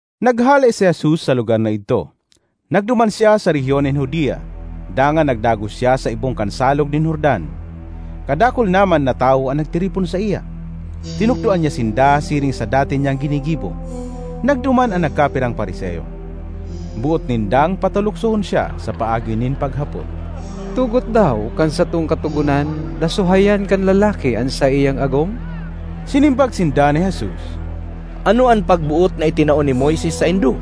Naghale si Jesus sa lugar na idto. Nagduman siya sa rehiyon nin Judea, dangan nagdagos siya sa ibong kan Salog nin Jordan. Kadakul naman na tawo an nagtiripon saiya. Tinukdoan niya sinda siring sa dati niyang ginigibo. Nagduman an nagkapirang Fariseo. Boot nindang pataluksohon siya sa paagi nin paghapot, “Tugot daw kan satong Katogonan na suhayan kan lalaki an saiyang agom?” Sinimbag sinda ni Jesus, “Ano an pagboot na itinao ni Moises saindo?”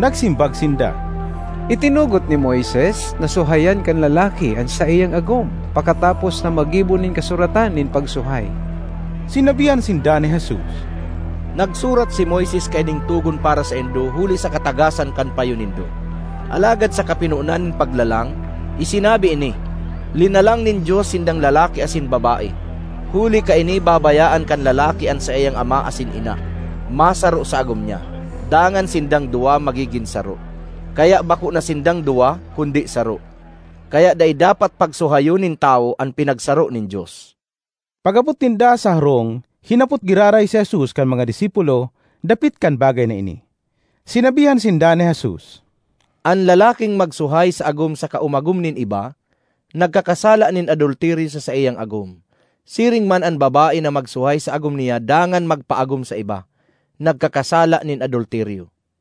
Nagsimbag sinda, “Itinugot ni Moises na suhayan kan lalaki an saiyang agom pakatapos na maggibo nin kasuratan nin pagsuhay.” Sinabihan sinda ni Jesus, “Nagsurat si Moises kaining togon para saindo huli sa katagasan kan payo nindo. Alagad sa kapinonan nin paglalang, isinabi ini, ‘Linalang nin Dios sindang lalaki asin babae. Huli kaini, babayaan kan lalaki an saiyang ama asin ina, masaro sa agom niya, dangan sindang duwa magigin saro.’ Kaya bako na sinda(ng) duwa, kundi saro. Kaya dai dapat pagsuhayon nin tawo an pinagsaro nin Dios.” Pag-abot ninda sa harong, hinapot giraray si Jesus kan mga disipulo dapit kan bagay na ini. Sinabihan sinda ni Jesus, “An lalaking magsuhay sa agom saka umagom nin iba, nagkakasala nin adulteryo sa saiyang agom; siring man an babae na magsuhay sa agom niya dangan magpaagom sa iba, nagkakasala nin adulteryo.”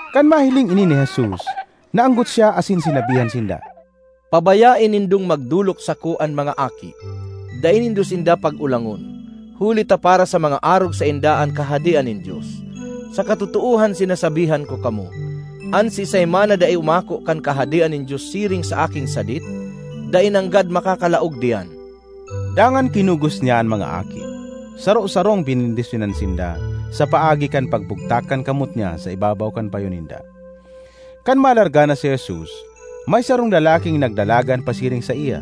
Kan mahiling ini ni Jesus, naanggot siya asin sinabihan sinda, “Pabayae nindong magdolok sako an mga aki! Dai nindo sinda pag-olangon, huli ta para sa mga arog sainda an Kahadean nin Dios. Sa katotoohan sinasabihan ko kamo, an siisay man na dai umako kan Kahadean nin Dios siring sa aking sadit dai nanggad makakalaog diyan.” Dangan kinugos niya an mga aki, saro-sarong benendisyonan sinda sa paagi kan pagbugtak kan kamot niya sa ibabaw kan payo ninda. Kan malarga na si Jesus, may sarong lalaking nagdalagan pasiring saiya,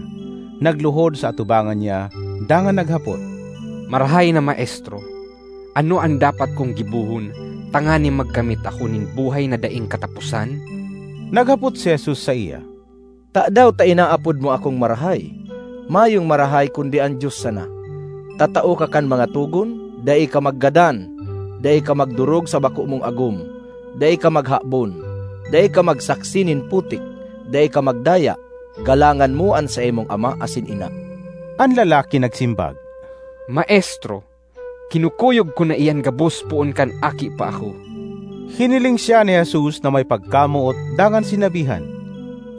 nagluhod sa atubangan niya dangan naghapot, “Marahay na Maestro, ano an dapat kong gibohon tanganing magkamit ako nin buhay na daing kataposan?” Naghapot si Jesus saiya, “Tadaw ta inaapod mo akong marahay? Mayong marahay kundi an Dios sana. Tatao ka kan mga togon: ‘Dai ka maggadan; dai ka magdorog sa bako mong agom; dai ka maghabon; dai ka magsaksi nin putik; dai ka magdaya; galangan mo an saimong ama asin ina.’” An lalaki nagsimbag, “Maestro, kinukuyog ko na iyan gabos poon kan aki pa ako.” Hiniling siya ni Jesus na may pagkamoot dangan sinabihan,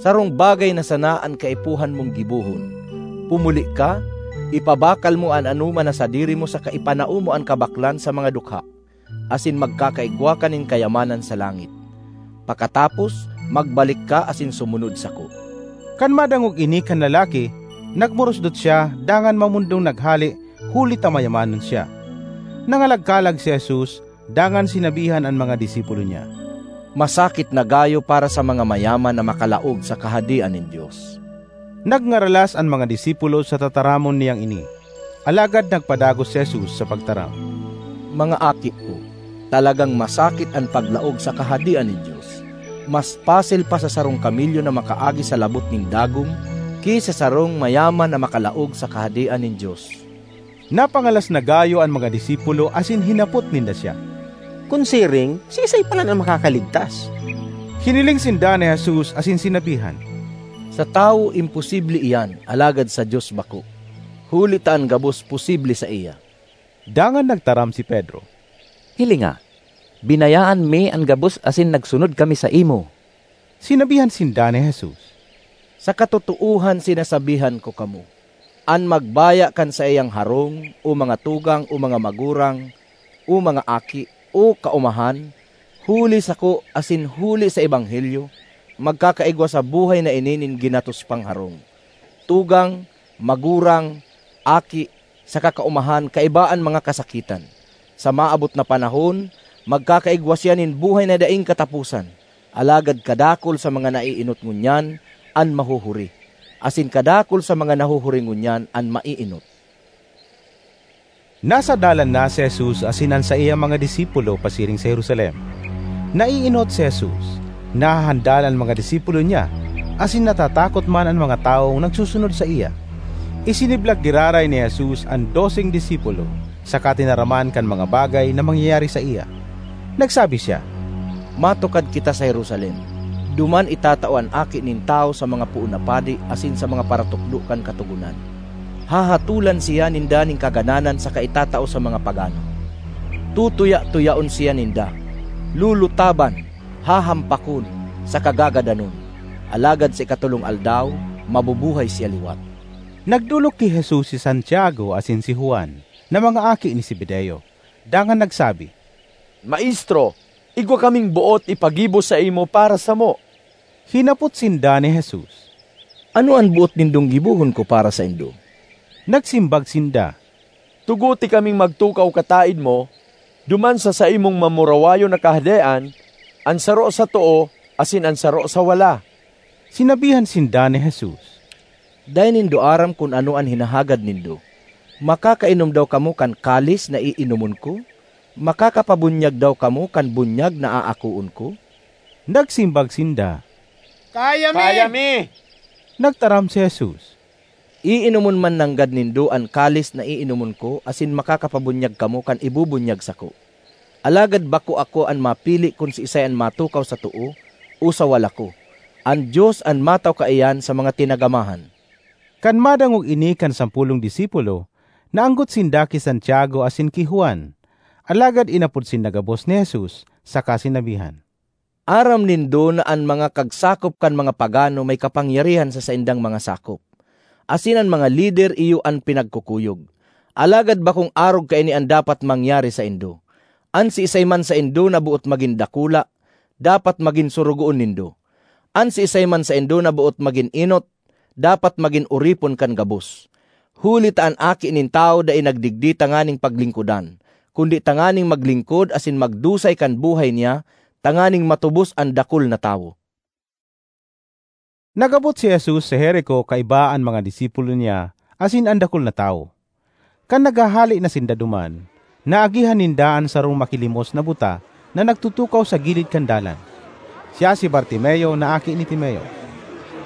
“Sarong bagay na sana an kaipuhan mong gibohon. Pumuli ka, ipabakal mo an anoman na sadiri mo saka ipanao mo an kabaklan sa mga dukha, asin magkakaigwa ka nin kayamanan sa langit. Pakatapos, magbalik ka asin sumunod sako.” Kan madangog ini kan lalaki, nagmurusdot siya dangan mamondong naghale huli ta mayamanon siya. Nangalagkalag si Jesus dangan sinabihan an mga disipulo niya, “Masakit na gayo para sa mga mayaman na makalaog sa Kahadean nin Dios.” Nagngaralas an mga disipulo sa tataramon niyang ini, alagad nagpadagos si Jesus sa pagtaram, “Mga aki ko, talagang masakit an paglaog sa Kahadean nin Dios! Mas pasil pa sa sarong kamelyo na makaagi sa labot nin dagom ki sa sarong mayaman na makalaog sa Kahadean nin Dios.” Napangalas na gayo an mga disipulo asin hinapot ninda siya, “Kun siring, siisay palan an makakaligtas?” Hiniling sinda ni Jesus asin sinabihan, “Sa tawo imposible iyan alagad sa Dios bako; huli ta an gabos posible saiya.” Dangan nagtaram si Pedro, “Hilinga, binayaan mi an gabos asin nagsunod kami saimo.” Sinabihan sinda ni Jesus, “Sa katotoohan sinasabihan ko kamo, an magbaya kan saiyang harong, o mga tugang, o mga magurang, o mga aki, o kaomahan, huli sako asin huli sa ebanghelyo, magkakaigwa sa buhay na ini nin ginatos pang harong, tugang, magurang, aki, saka kaomahan kaiba an mga kasakitan. Sa maabot na panahon magkakaigwa siya nin buhay na daing kataposan. Alagad kadakul sa mga naeenot ngunyan an mahuhuri; asin kadakul sa mga nahuhuri ngunyan an maeenot.” Nasa dalan na si Jesus asin an saiyang mga disipulo pasiring sa Jerusalem. Naeenot si Jesus; nahahandal an mga disipulo niya, asin natatakot man an mga tawong nagsusunod saiya. Isiniblag giraray ni Jesus an doseng disipulo saka tinaraman kan mga bagay na mangyayari saiya. Nagsabi siya, “Matukad kita sa Jerusalem. Duman itatao an Aki nin Tawo sa mga poon na padi asin sa mga paratukdo kan Katogonan. Hahatolan siya ninda nin kagadanan saka itatao sa mga pagano. Tutuya-tuyaon siya ninda, lulutaban, hahampakon, saka gagadanon. Alagad sa ikatolong aldaw mabubuhay siya liwat.” Nagdolok ki Jesus si Santiago asin si Juan, na mga aki ni Zebedeo, dangan nagsabi, “Maestro, igwa kaming boot ipagibo saimo para samo.” Hinapot sinda ni Jesus, “Ano an boot nindong gibohon ko para saindo?” Nagsimbag sinda, “Tugote kaming magtukaw kataed mo duman sa saimong mamurawayon na Kahadean, an saro sa too asin an saro sa wala.” Sinabihan sinda ni Jesus, “Dai nindo aram kun ano an hinahagad nindo. Makakainom daw kamo kan kalis na iinomon ko? Makakapabunyag daw kamo kan bunyag na aakoon ko?” Nagsimbag sinda, “Kaya mi.” Nagtaram si Jesus, “Iinomon man nanggad nindo an kalis na iinomon ko asin makakapabunyag kamo kan ibubunyag sako. Alagad bako ako an mapili kun siisay an matukaw sa too o sa wala ko; an Dios an matao kaiyan sa mga tinagamahan.” Kan madangog ini kan sampolong disipulo, naanggot sinda ki Santiago asin ki Juan. Alagad inapod sinda gabos ni Jesus saka sinabihan, “Aram nindo na an mga kagsakop kan mga pagano may kapangyarihan sa saindang mga sakop, asin an mga lider iyo an pinagkukuyog. Alagad bakong arog kaini an dapat mangyari saindo. An siisay man saindo na boot magin dakula, dapat magin sorogoon nindo; an siisay man saindo na boot magin enot, dapat magin oripon kan gabos. Huli ta an Aki nin Tawo dai nagdigdi tanganing paglingkodan kundi tanganing maglingkod asin magdusay kan buhay niya tanganing matubos an dakul na tawo.” Nag-abot si Jesus sa Jerico kaiba an mga disipulo niya asin an dakul na tawo. Kan naghahale na sinda duman, naagihan ninda an sarong makilimos na buta na nagtutukaw sa gilid kan dalan; siya si Bartimeo na aki ni Timeo.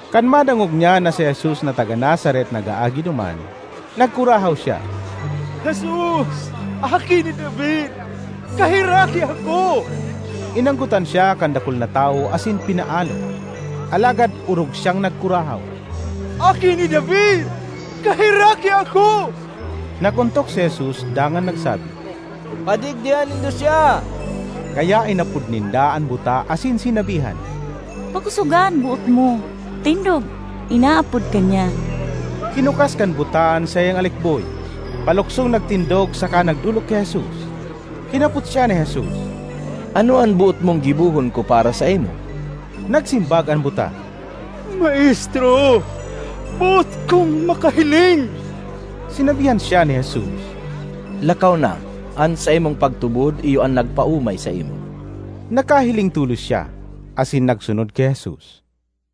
Kan madangog niya na si Jesus na taga Nazaret nag-aagi duman, nagkurahaw siya, “Jesus, Aki ni David! Kaheraki ako!” Inanggotan siya kan dakul na tawo asin pinaalo; alagad orog siyang nagkurahaw, “Aki ni David, kaheraki ako!” Nag-ontok si Jesus dangan nagsabi, “Padigdiha nindo siya.” Kaya inapod ninda an buta asin sinabihan, “Pakosoga an boot mo! Tindog, inaapod ka niya.” Hinukas kan buta an saiyang alikboy, paluksong nagtindog saka nagdolok ki Jesus. Hinapot siya ni Jesus, “Ano an boot mong gibohon ko para saimo?” Nagsimbag an buta, “Maestro, boot kong makahiling.” Sinabihan siya ni Jesus, “Lakaw na; an saimong pagtubod iyo an nagpaomay saimo.” Nakahiling tolos siya, asin nagsunod ki Jesus.